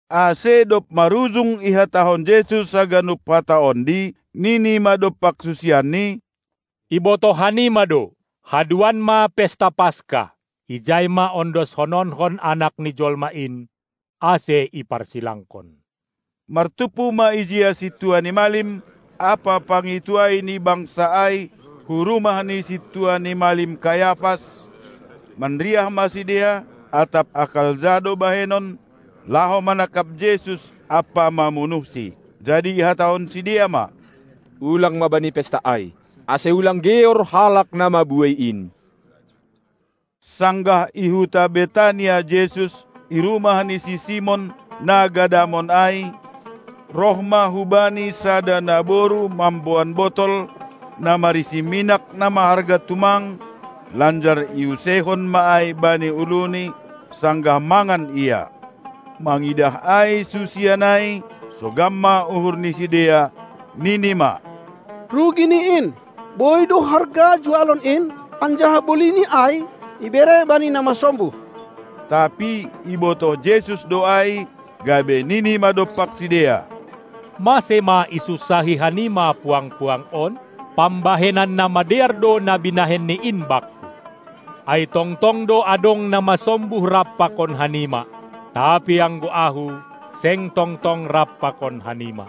Ase dob marujung ihatahon Jesus haganup hata ondi, nini ma dompak susianNi: Ibotoh hanima do, haduan ma pesta Paska, ijai ma ondoskononkon Anak ni jolma in, ase iparsilangkon. Martumpu ma ijia sintua ni malim ampa pangintuai ni bangsa ai hu rumah ni sintua ni malim Kayafas; manriah ma sidea atap akal ja do bahenon, laho manangkap Jesus ampa mamunuhSi. Jadi ihatahon sidea ma: Ulang ma bani pesta ai, ase ulang geor halak na mabuei in. Sanggah i huta Betania Jesus, i rumah ni si Simon, na gadamon ai, roh ma hu Bani sada naboru mamboan botol, na marisi minak na maharga tumang, lanjar iuseihon ma ai bani uluNi, sanggah mangan Ia. Mangidah ai susian ai, sogam ma uhur ni sidea, nini ma: Rugi ni in! Boi do harga jualon in, anjaha bolini ai ibere bani na masombuh. Tapi ibotoh Jesus do ai, gabe nini ma dompak sidea: Mase ma isunsahi hanima puang-puang on? Pambahenan na madear do na binahenni in Bakku. Ai tongtong do adong na masombuh rap pakon hanima, tapi anggo Ahu, seng tong-tong rap pakon hanima.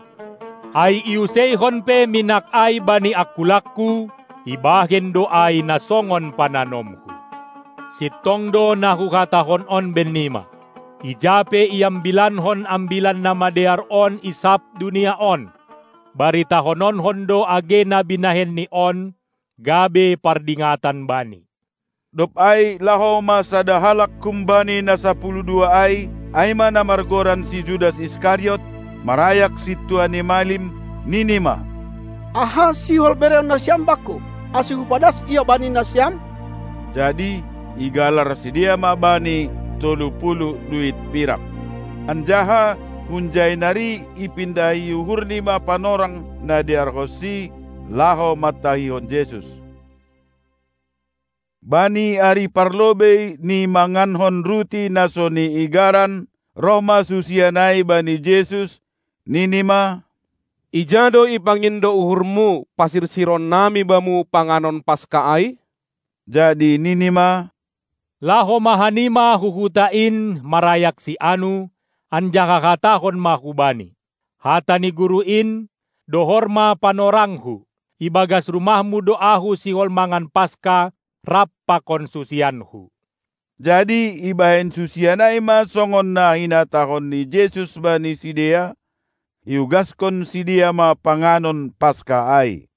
Ai iuseihon pe minak ai bani angkulangKu, ibahen do ai na songon pananomHu. Sintong do na Huhatahon on bennima: Ija pe iambilankon Ambilan Namadear on i sab dunia on, baritahononkon do age na binahenni on, gabe pardingatan bani. Dob ai laho ma sada halak humbani na sapuluh dua ai, ai ma na margoran si Judas Iskariot, marayak sintua ni malim, nini ma: Aha sihol bereon nasiam bakku, ase hupadas Ia bani nasiam? Jadi igalar sidea ma bani tolu puluh duit pirak. Anjaha hunjai nari ipindahi uhurni ma panorang na dearhonsi, laho mantahihon Jesus. Bani ari parlobei ni mangankon ruti na so niigaran, roh ma susian ai bani Jesus, nini ma: Ija do ipangindo uhurMu pasirsironnami Bamu panganon Paska ai? Jadi nini ma: Laho ma hanima hu huta in, marayak si anu, anjaha hatahon ma hubani: Hata ni guru in: Dohor ma panorangKu, ibagas rumahmu do Ahu sihol mangan Paska rap pakon susianKu. Jadi ibahen susian ai ma songon na hinatahon ni Jesus bani sidea; iugaskon sidea ma panganon Paska ai.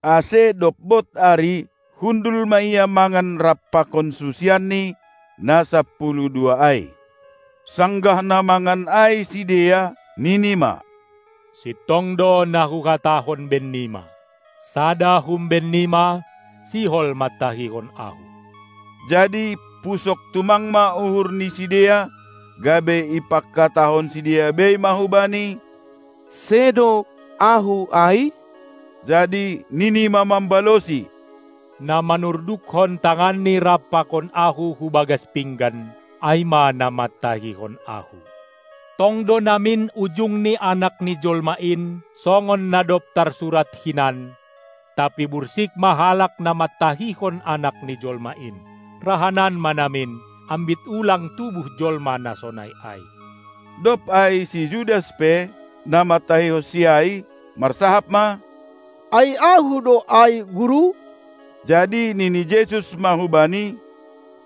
Ase dob bod ari hundul ma Ia mangan rap pakon susianNi na sapuluh dua ai. Sanggah na mangan ai sidea, nini ma: Sintong do na Huhatahon bennima: Sada humbennima sihol mantahihon Ahu! Jadi pusok tumang ma uhur ni sidea, gabe ipangkatahon sidea bei ma hu Bani: Sedo ahu ai? Jadi nini ma mambalosi: Na manurdukkon tanganni rap pakon Ahu hu bagas pinggan, ai ma na mantahihon Ahu. Tong do namin ujung ni Anak ni jolma in, songon na dob tarsurat hinan, tapi bursik ma halak na mantahihon Anak ni jolma in. Rahanan ma namin, ambit ulang tubuh jolma na sonai ai. Dob ai si Judas pe, na mantahihonsi ai, marsahap ma: Ai ahu do ai, Guru? Jadi nini Jesus ma hubani: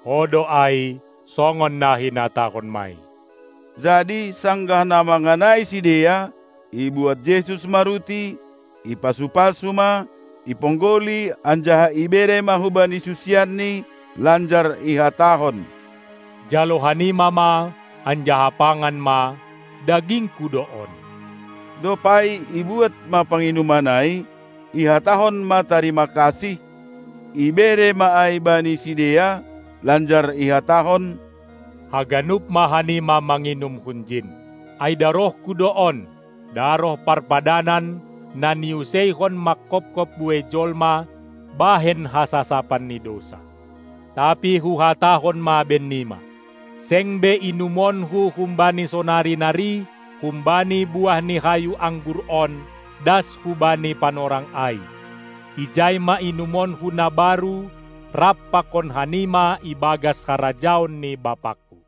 Ho do ai, songon na hinatahonmai Jadi sanggah na mangan ai sidea, ibuat Jesus ma ruti, ipasu-pasu ma, iponggoli anjaha ibere ma hubani susianNi, lanjar ihatahon: Jalo hanima ma, anjaha pangan ma, dagingKu do on! Dob ai ibuat ma panginuman ai, ihatahon ma tarima kasih, ibere ma ai bani sidea, lanjar ihatahon: Haganup ma hanima manginum hunjin! Ai darohKu do on, daroh parpadanan, na niuseihon mangkopkop buei jolma, bahen hasasapan ni dousa. Tapi Huhatahon ma bennima: Seng be inumonKu humbani sonari nari humbani buah ni hayu anggur on das hubani panorang ai, ijai ma inumonKu na baru rap pakon hanima ibagas harajaon ni BapangKu.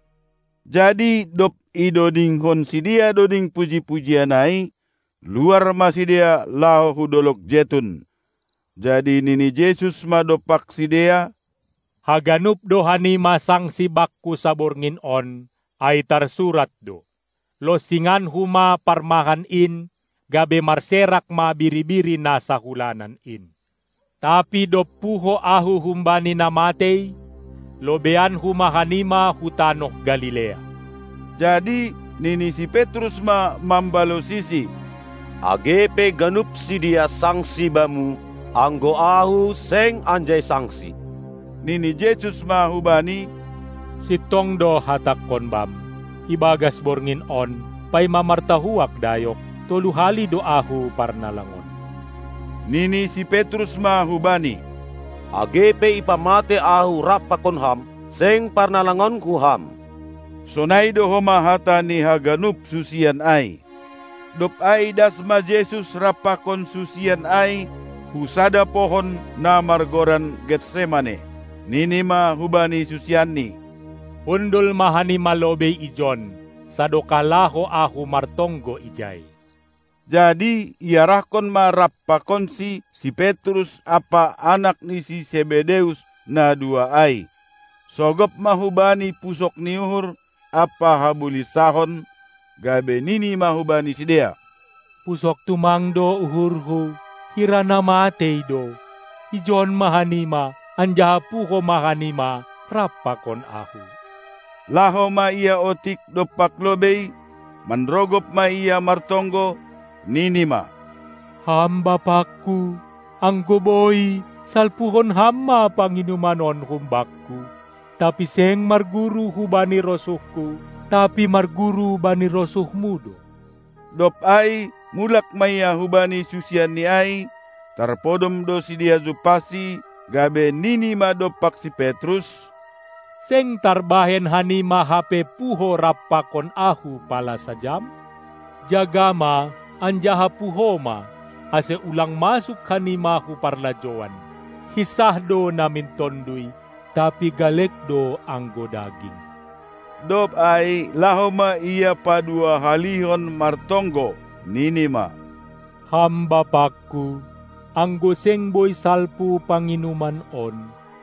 Jadi dob idodingkon sidea doding puji-pujian ai, luar ma sidea laho hu dolog Jetun. Jadi nini Jesus ma dompak sidea: Haganup do hanima sangsi Bakku saborngin on, ai tarsurat do. LonsinganKu ma parmahan in, gabe marserak ma biri-biri na sahulanan in. Tapi dob puho Ahu humbani na matei, lobeianKu ma hanima hu tanoh Galilea. Jadi nini si Petrus ma mambalosiSi: Age pe ganup sidea sangsi Bamu, anggo ahu seng anjai sangsi. Nini Jesus ma hubani: Sintong do Hatangkon bam: Ibagas borngin on, paima martahuak dayok, tolu hali do Ahu parnalangonmu. Nini si Petrus ma hu-Bani: Age pe ipamatei ahu rap pakon Ham, seng parnalangonku Ham. Sonai do homa hatani haganup susian ai. Dob ai das ma Jesus rap pakon susian ai hu sada pohon na margoran Getsemane. Nini ma hubani susianNi: Hundul ma hanima lobei ijon, sadokah laho Ahu martonggo ijai. Jadi iarahkon ma rap pakonSi si Petrus ampa anak ni si Sebedeus na dua ai. Sogop ma hu Bani pusok ni uhur ampa habulinsahon, gabe nini ma hubani sidea: Pusok tumang do uhurHu, hira na matei do. Ijon ma hanima, anjaha puho ma hanima rap pakon Ahu. Laho ma Ia otik dompak lobei, manrogop ma Ia martonggo, nini ma: Ham BapangKu, anggo boi, salpuhon Ham ma panginuman on hum Bakku! Tapi seng marguru hubani rosuhKu, tapi marguru bani rosuhMu do. Dob ai mulak ma Ia hubani susianNi ai, tarpodom do sidea jumpahSi, gabe nini ma dompak si Petrus: Seng tarbahen hanima hape puho rap pakon Ahu pala sajam? Jaga ma anjaha puho ma, ase ulang masuk hanima hu parlajouan. Hinsah do namin tonduy, tapi galek do anggo daging. Dob ai laho ma Ia padua-halihon martonggo, nini ma: Ham BapangKu, anggo seng boi salpu panginuman on,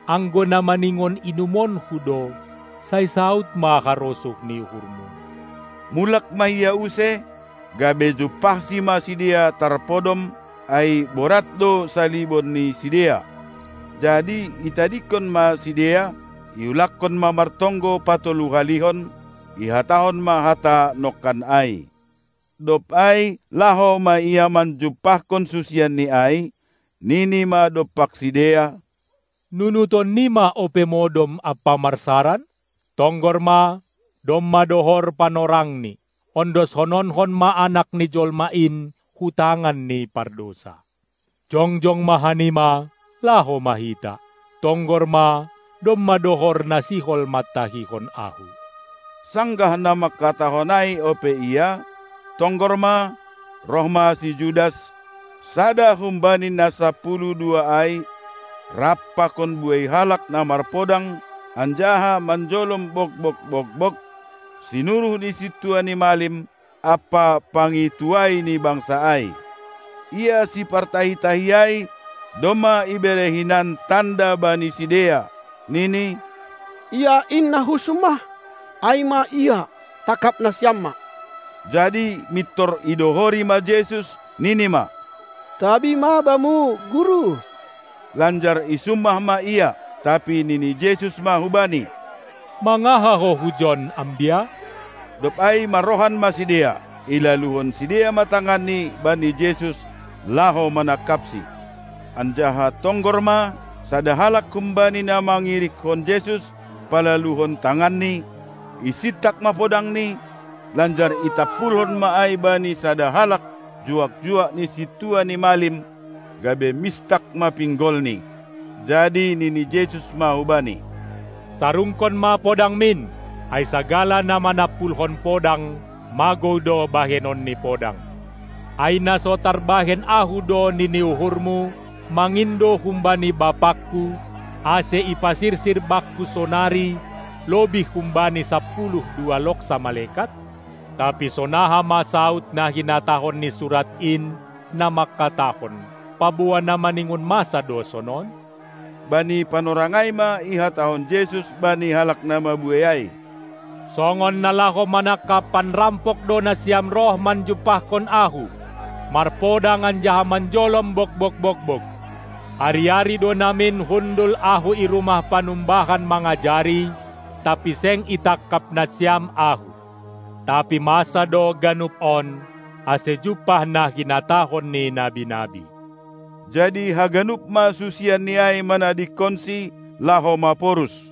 anggo na maningon inumonKu do, sai saud ma harosuh ni uhurMu. Mulak ma Ia use, gabe jumpahSi ma sidea tarpodom, ai borat do salibon ni sidea. Jadi itadingkon ma sidea, iulakkon ma martonggo patolu halihon, ihatahon ma hata nongkan ai. Dob ai laho ma Ia manjumpahkon susianNi ai, nini ma dompak sidea: Nunutonnima ope modom ampa marsaran? Tonggor ma, domma dohor panorangni, ondoskononkon ma Anak ni jolma in hu tangan ni pardousa. Jongjong ma hanima, laho ma hita! Tonggor ma, domma dohor na sihol mantahihon Ahu. Sanggah na mangkatahon ai ope Ia, tonggor ma, roh ma si Judas, sada humbani na sapuluh dua ai, rap pakon buei halak na marpodang anjaha manjolom bogbog-bogbog, sinuruh ni sintua ni malim ampa pangintuai ni bangsa ai. Ia sipartahi-tahi ai domma ibere hinan tanda bani sidea, nini: Ia in na husummah, ai ma Ia, tangkap nasiam ma! Jadi mintor idohori ma Jesus, nini ma: Tabi ma Bamu, Guru! lanjar isummah ma Ia. Tapi nini Jesus ma hu-Bani: Mangaha ho hujon, ambia? Dob ai marrohan ma sidea, ilaluhon sidea ma tanganni bani Jesus laho manangkapSi. Anjaha tonggor ma, sada halak humbani na mangirikkon Jesus palaluhon tanganni, isintak ma podangni, lanjar itampulhon ma ai bani sada halak juak-juak ni sintua ni malim, gabe mistak ma pinggolni. Jadi nini Jesus ma hubani: Sarungkon ma podangmin! Ai sagala na manampulhon podang, magou do bahenon ni podang. Ai na so tarbahen Ahu do, nini uhurmu, mangindo humbani BapangKu, ase ipasirsir Bakku sonari lobih humbani sapuluh dua loksa malekat? Tapi sonaha ma saud na hinatahon ni surat in, na mangkatahon, paboa na maningon masa do sonon? Bani panorang ai ma ihatahon Jesus bani halak na mabuei ai: Songon na laho manangkap panrampok do nasiam roh manjumpahkon Ahu, marpodang anjaha manjolom bogbog-bogbog. Ari-ari do namin hundul Ahu i rumah panumbahan mangajari, tapi seng itangkap nasiam Ahu. Tapi masa do ganup on, ase jumpah na hinatahon ni nabi-nabi. Jadi haganup ma susianNi ai manadingkonSi, laho maporus.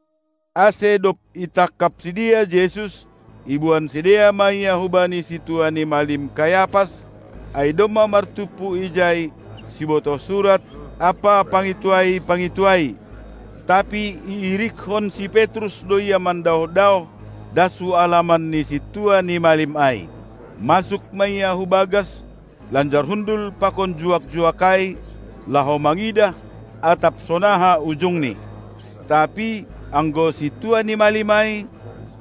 Ase dob itangkap sidea Jesus, iboan sidea ma Ia hubani sintua ni malim Kayapas, ai domma martumpu ijai sibotoh surat ampa pangintuai-pangintuai. Tapi iirikkon si Petrus do Ia mandaoh-daoh das hu alaman ni sintua ni malim ai. Masuk ma ia hubagas lanjar hundul pakon juak-juak ai, laho mangidah atap sonaha ujungni. Tapi anggo sintua ni malim ai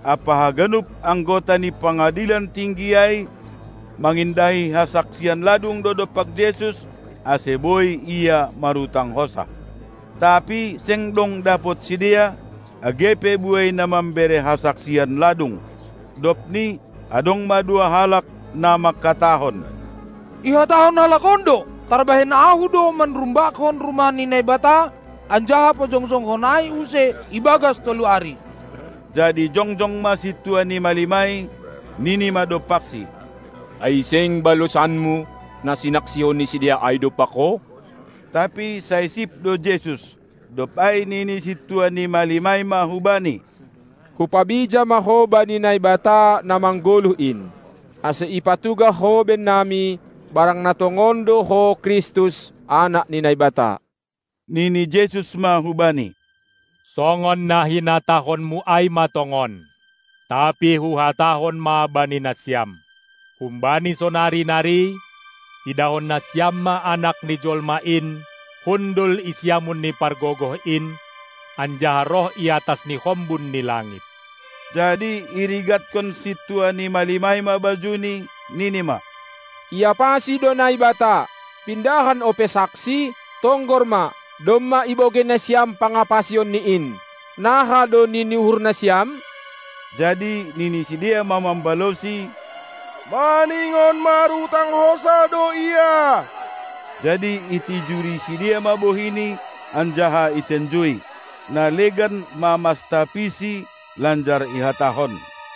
ampa haganup anggota ni Pangadilan Tinggi ai mangindahi hasaksian ladung do dompak Jesus, ase boi Ia marutang hosah. Tapi seng dong dapot sidea, age pe buei na mambere hasaksian ladung. Dobni adong ma dua halak, na mangkatahon: Ihatahon halak on do: Tarbahen Ahu do manrumbakkon rumah ni Naibata, anjaha pajongjongkon ai use ibagas tolu ari. Jadi jongjong ma sintua ni malim ai, ninima dompakSi: Ai seng balosanMu na sinaksihon ni sidea ai dompak Ho? Tapi sai sip do Jesus. Dob ai nini sintua ni malim ai ma hu Bani: Hupabija ma Ho bani Naibata na manggoluh in, ase ipatugah Ho bennami, barang na tongon do Ho Kristus, Anak ni Naibata! Nini Jesus ma hubani: Songon na hinatahonmu ai ma tongon! Tapi Huhatahon ma bani nasiam: Humbani sonari nari, idahon nasiam ma Anak ni jolma in hundul i siamun ni Pargogoh in, anjaha roh iatas ni hombun ni langit. Jadi irigatkon sintua ni malim ai ma bajuNi, nini ma: Iapasi do Naibata! Pindahan ope saksi? Tonggor ma, domma ibogei nasiam pangapasionNi in! Naha do nini uhur nasiam? Jadi nini sidea ma mambalosi: Maningon marutang hosah do Ia! Jadi itijuri sidea ma bohiNi anjaha itenjui. Na legan mamastapiSi, lanjar ihatahon: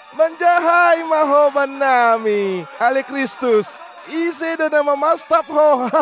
Manjahai ma Ho bannami, ale Kristus, ise do na mamastap Ho?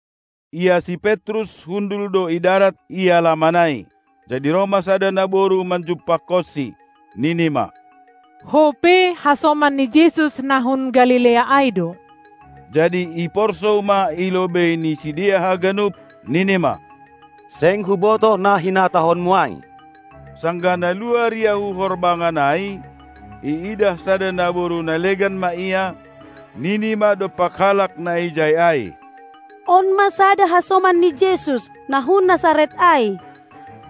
Ia si Petrus hundul do i darat i alaman ai. Jadi roh ma sada naboru manjumpahkonsi, nini ma: Ho pe hasoman ni Jesus na hun Galilea ai do! Jadi iporsou ma i lobei ni sidea haganup, nini ma: Seng hubotoh na hinatahonmu ai! Sanggah na luar ia hu horbangan ai, iidah sada naboru na legan ma ia, nini ma dompak halak na ijai ai: On ma sada hasoman ni Jesus, na hun Nasaret ai!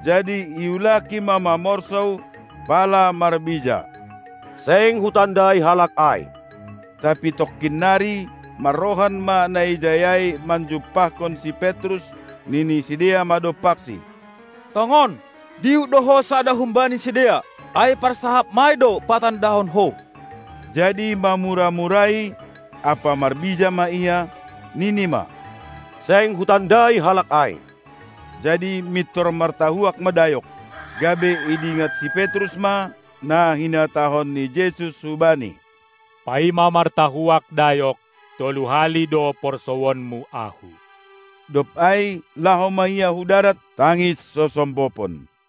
Jadi iulaki ma mamorsou, pala marbija: Seng hutandai Halak ai! Tapi tongkin nari, marrohan ma na ijai ai manjumpahkon si Petrus, nini sidea ma dompaksi: Tongon, dihut do ho sada humbani sidea, ai parsahapmai do patandahon ho! Jadi mamura-murai ampa marbijai ma ia, nini ma: Seng hutandai Halak ai! Jadi mintor martahuak ma dayok. Gabe idingat si Petrus ma na hinatahon ni Jesus hubani: Paima martahuak dayok, tolu hali do porsouonmu Ahu. Dob ai laho ma ia hu darat tangis sosombopon.